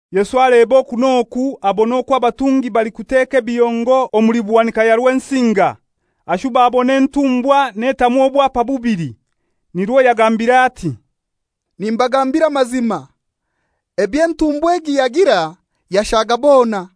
Yesu aleba oku n'oku abona okwo abatungi balikuteka ebihongo omuli buhanika ya Rwensinga. Ashuba abona entumbwakazi netamu obwapa bubili. Nirwo yagambire ati, «Nimbagambira amazima, eby'entumbwa egi yagira yashaga bona.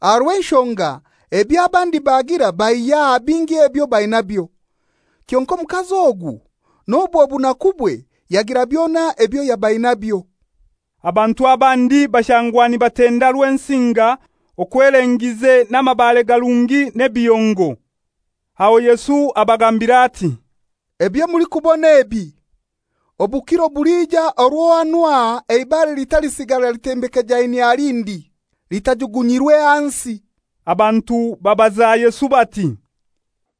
Aha rw'enshonga ebyo abandi bagira baihya aha bingi ebyo bainabyo, kyonkai omukazi ogu n'obwo bunakubwe yagira byona ebyo yaba ainabyo.» Abantu abandi bashangwa nibatenda Rwensinga okwo elengize n'amabare garungi n'ebihongo. Aho Yesu abagambira ati, «Ebyo mulikubona ebi, obukiro bulija orwo hanu aha eibare litalisigara litembekejainyie aha lindi, litajugunyirwe hansi.» Abantu babaza Yesu bati,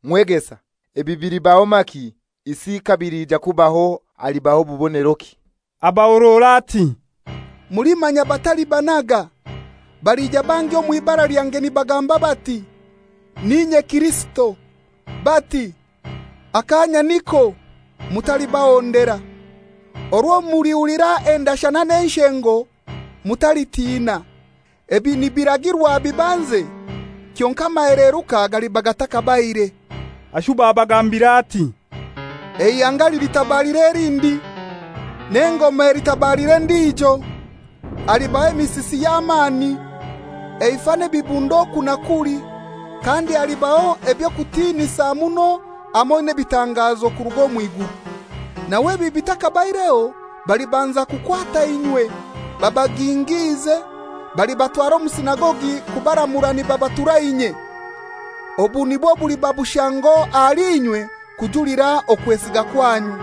«Mwegesa, ebi bilibaho maki, isi kabiliija kubaho halibaho buboneroki?» Abahorora ati, «Mulimanya batalibanaga. Balija bangi omw'ibara lyange nibagamba bati, ‹N'inye Kirisito!› Bati, ‹Akaanya niko!› Mutalibahondera. Orwo mulihulira endashana n'enshengo, mutalitina. Ebi nibiragirwa bibanze, kyonkai amaheleruka galiba gatakabaire.» Ashuba abagambira ati, «Eihanga lilitabalira elindi, n'engoma elitabalira endijo. Halibaho emisisi y'amani, eifa n'ebibundo oku na kuli. Kandi halibaho eby'okutiinisa muno hamoi n'ebitangazo kuruga omw'iguru. Nawe ebi bitakabaireho balibanza kukwata inywe, babagingiize, balibatwara omu sinagogi kubaramura nibabatura inye. Obu nibwo buliba bushango ahali inywe kujulira okwesiga kwanyu.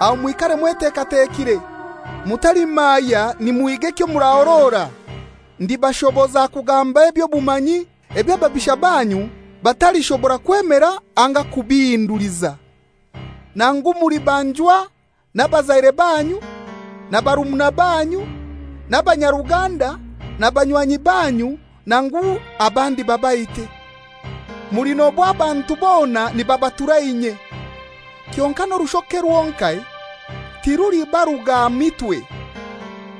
Aho mwikare mwetekatekire, mutalimaaya nimuhiga ekyo murahorora. Ndibashoboza kugamba eby'obumanyi, ebyo ababisha banyu batalishobora kwemera anga kubihinduliza. Nangu mulibanjwa n'abazaire banyu, na barumuna banyu, n'abanyaruganda, na banywanyi banyu nangu abandi babaite. Mulinobwa abantu bona nibabatura inye. Kyonkai n'orushoke rwonkai tirulibaruga aha mitwe.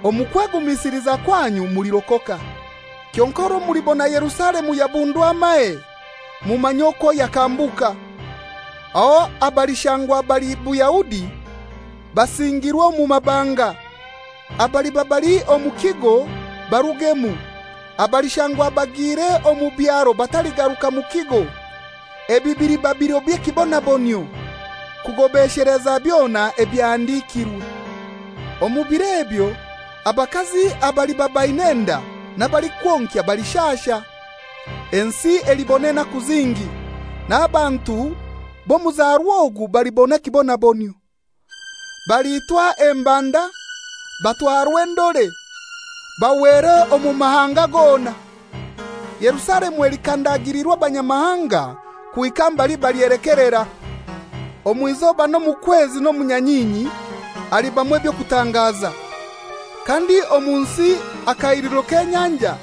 Omu kwegumisiliza kwanyu mulirokoka. «Kyonkai orwo mulibona Yerusalemu yabundwa amahe, mumanye okwo yakambuka. Aho abalishangwa bali Buyahudi basingirwe omu mabanga. Abaliba bali omu kigo barugemu. Abalishangwa bagiire omu byaro bataligaruka mu kigo. Ebi biliba biro by'ekibonabonyio, kugobesheleza byona ebyahandikirwe. Omu biro ebyo abakazi abaliba baina enda n'abalikwonkya balishasha! Ensi elibona enaku zingi, n'abantu b'omuzarwa ogu balibona ekibonabonyio. Baliitwa embanda, batwarwe endore, bahwere omu mahanga gona. Yerusalemu elikandagilirwa abanyamahanga kuhika mbali balyelekelera. «Omw'izoba n'omu kwezi n'omu nyanyinyi, halibamu eby'okutangaza, kandi omu nsi akahiliro k'enyanja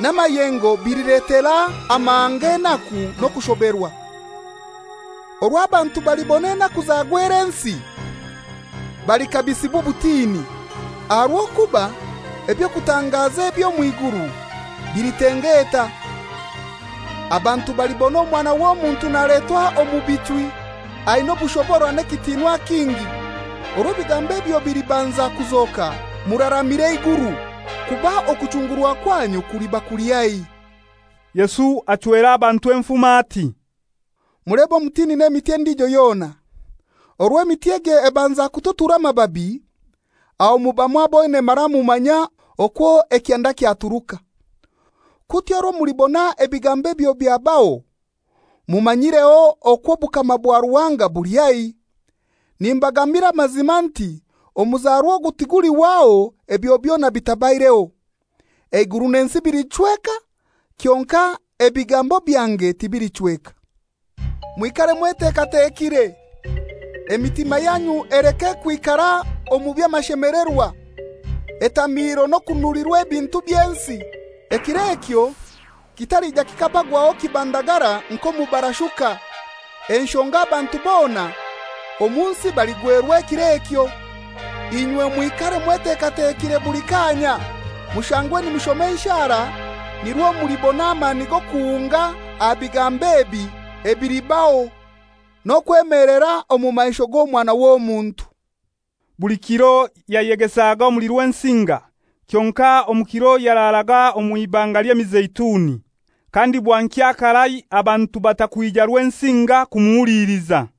n'amayengo bililetera amahanga enaku n'okushoberwa. Orwo abantu balibona enaku zagwera ensi balikabisibwa obutini, aha rw'okuba eby'okutangaza eby'omw'iguru bilitengeeta. Abantu balibona Omwana w'Omuntu naletwa omu bichwi aina obushobora n'ekitinwa kingi. Orwo ebigambo ebyo bilibanza kuzoka muraramire eiguru, kuba okuchungurwa kwanyu kuliba kuli haihi.» Yesu achwera abantu enfumo, ati, «Mulebe omutini n'emiti endijo yona. Orwo emiti egyo ebanza kututura amababi, aho muba mwaboine mara mumanya okwo ekyanda kyaturuka. Kutyo orwo mulibona ebigambo ebyo byabaho, mumanyireho okwo obukama bwa Ruhanga buli haihi. Nimbagambira amazima nti omuzarwa ogu tigulihwaho ebyo byona bitabaireho. Eiguru n'ensi bilichweka, kyonkai ebigambo byange tibilichweka. «Mwikare mwetekatekire! Emitima yanyu eleke kwikara omu by'amashemelerwa, etamiiro n'okunulirwa ebintu by'ensi, ekiro ekyo kitalija kikabagwagwaho kibandagara nk'omubarashuka. Enshonga abantu bona omu nsi baligwerwa ekiro ekyo. Inywe mwikare mwetekatekire buli kaanya, mushangwe nimushoma enshara nirwo mulibona amani g'okuhunga aha bigambo ebi ebilibaho, n'okwemelera omu maisho g'Omwana w'Omuntu.» Buli kiro yayegesaga omuli Rwensinga, kyonkai omu kiro yararaga omw'Ibanga ly'Emizeituni. Kandi bwankya karai abantu bata kwija Rwensinga kumuhuliliza.